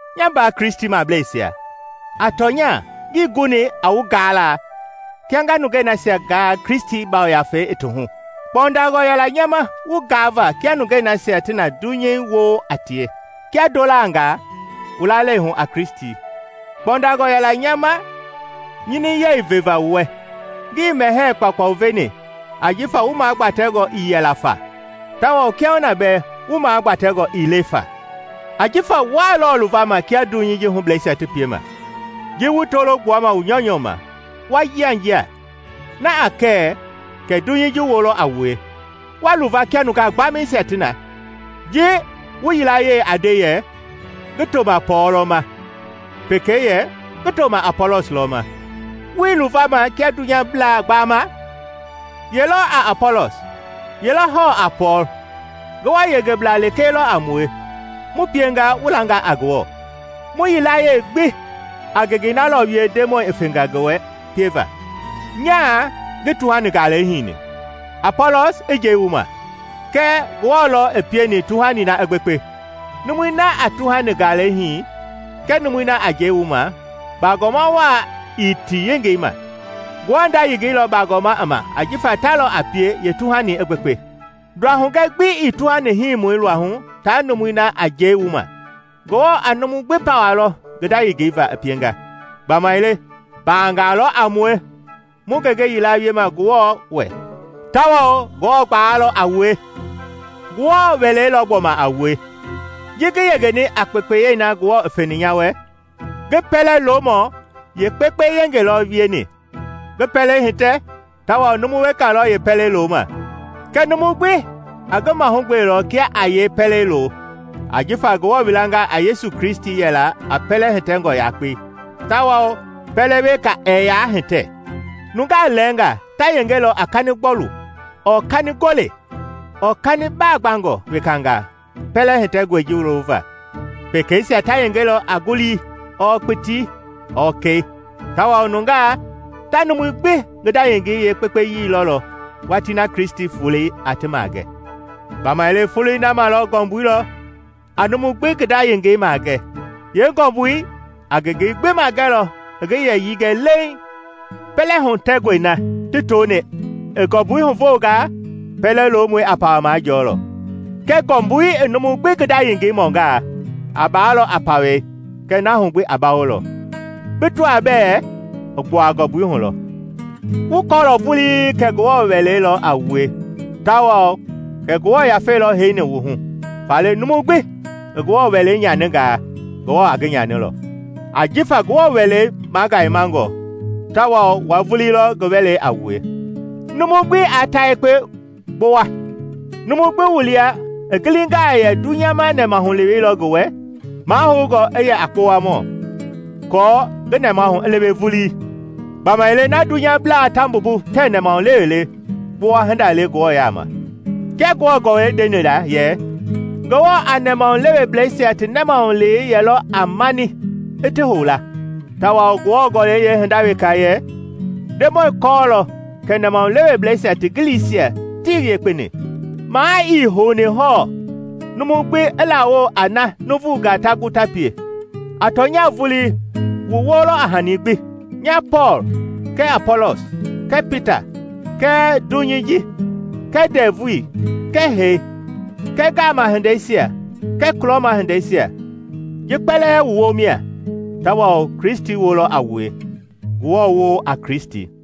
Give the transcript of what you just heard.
Nya mbaa Kristimableisia, a tɔnya ngii guni a wu gaala kia nga nungei nasia gaa Kristi Yafei i ti hu; kpɔndangɔ yɛla nya ma wu gaava kia nungei nasia ti na dunyei woo a tie, kia ndolangaa wu lalei hu a Kristi. Kpɔndangɔ yɛla nya ma nyiniyɛi veva wu wɛ, ngii mɛhɛɛ kpaukpau veni ajifa wu magbatɛngɔ ii yɛla fa, tawao kiahuna bɛɛ wu magbatɛngɔ ii le fa. Ajifa wuaa lɔɔ luvama kia dunyei ji hublɛisia ti piema. Ji wu tolo gbuama wu nyɔunyɔ ma, wa yianjia, na ɛɛ kɛ kɛ dunyei ji woo lɔ a wue, wa luva kia nungaa gbamɛisia? Ji wu yilayee a nde yɛ, “Ngi toma Pɔɔl lɔ ma,” pekei yɛ, “Ngi toma Apɔlɔs lɔ ma” wuii luvama kia dunyablaa gbaama? Ye lɔ a Apɔlɔs? Ye lɔ a hɔɔ a Pɔɔl? Ngewɔ yengeblaa lekee lɔ a mue, mu pienga wu langa a Ngewɔ. Mu yilayee gbi a ngengei na lɔ wie Ndemɔi i fenga ngi wɛ pieva. Nyaa ngi tuhani-galei hini, Apɔlɔs i njɛi wu ma, kɛɛ Ngewɔ lɔ i pieni tuhani na i gbekpe. Numui na a tuhani-galei hii kɛɛ numui na a njɛi wu ma bagɔma waa ii ti yengei ma. Ngewɔ nda yengei lɔ bagɔma i ma ajifa ta lɔ a pie yeetuhani i gbekpe. Nduahugɛ gbi ii tuhani hiimɔi luahu taa numui na a njɛi wu ma; Ngewɔ a numu gbi pawalɔ ngi nda yengei va i pienga. Gbamaile mbangaa lɔ a mue mu ngenge yila wiema Ngewɔ wɛ, tawao Ngewɔ gbalei lɔ a wue. Ngewɔ wɛlei lɔ gbɔma a wue. Ji ngi yengeni a kpekpeye na Ngewɔ i feni nya wɛ, ngi pɛlɛ-lomɔ yeekpekpe yenge lɔ wieni ngi pɛlei hitɛ, tawao numu weka lɔ yeepɛlei loma. Kɛɛ numu gbi a ngi mahugbelɔ kia a yee pɛlei loo. Ajifa Ngewɔ wilanga a Yesu Kristi yɛla a pɛlɛ-hitɛngɔ yakpei, tawao pɛlɛ weka ɛɛ yaa hitɛ. Nungaa lɛɛngaa ta yengelɔ a kani-gbɔlu ɔɔ kani-gole ɔɔ kani baagbangɔ wekangaa pɛlɛ hitɛngɔi ji lova; pekeisia ta yengelɔ a ngulii ɔɔ kpitii ɔɔ kɛi. Tawao nungaa ta numui gbi ngi nda yengei yekpeyii lɔlɔ watii na Kristi Volei a ti magɛ. Gbamaile Foloi na ma ngɔmbui lɔ a numu gbi ngi nda yengei maagɛ; yeengɔmbui a ngengei gbi maagɛlɔ i ngi yɛyii gɛ leeŋ. Pɛlɛ-hitɛngɔi na ti toni i ngɔmbui huvoongaa, pɛlɛ-lomɔi a pawa majɔɔlɔ. Kɛɛ ngɔmbui i numu gbi ngi nda yengei mɔngaa, a baalɔ a pawɛi kɛɛ na hugbi a bawolɔ, bi tɔaa bɛɛ i gbua ngɔmbui hu lɔ. Wu kɔɔlɔ vulii kɛ Ngewɔ wɛlei lɔ a wue tawao kɛ Ngewɔ Yafei lɔ heini wu hu! Faale numu gbi i Ngewɔ wɛlei nyaningaa, Ngewɔ a ngi nyanilɔ. Ajifa Ngewɔ wɛlei magayemangɔ, tawao wua vulii lɔ ngi wɛlei a wue. Numu gbi aa ta yekpe gbowa. Numu gbi wu lia i gilingaa yɛ dunyama nɛmahulewei lɔ ngi wɛ, mahoungɔ i yɛ a kpowamɔ aako ngi nɛmahu i lewe vulii. Gbamaile na dunyablaa ta mbumbu tɛɛ nɛmahulewe le, kpowa hinda le Ngewɔ yaama. Kia Ngewɔ Gɔlɛi ndeni la yɛ “Ngewɔ a nɛmahuleweblɛisia ti nɛmahulewei yɛlɔ a mani i ti hou la.” Tawao Ngewɔ Gɔlɛi yeehinda weka yɛ, “Ndemɔi kɔɔlɔ kɛ nɛmahuleweblɛisia ti giliisia tii yekpeni.” Maa ii houni hɔɔ numu gbi i lawo a na nuuvunga ta gu ti pie. A tɔnya vulii wu woo lɔ a hani gbi: Nya Pɔɔl kɛɛ Apɔlɔs kɛɛ Pita kɛɛ dunyei ji kɛɛ ndɛvui kɛɛ hee kɛɛ ngaama hindeisia kɛɛ kulɔma hindeisia ji kpɛlɛɛ wu woo mia, tawao Kristi woo lɔ a wue, Ngewɔ woo a Kristi.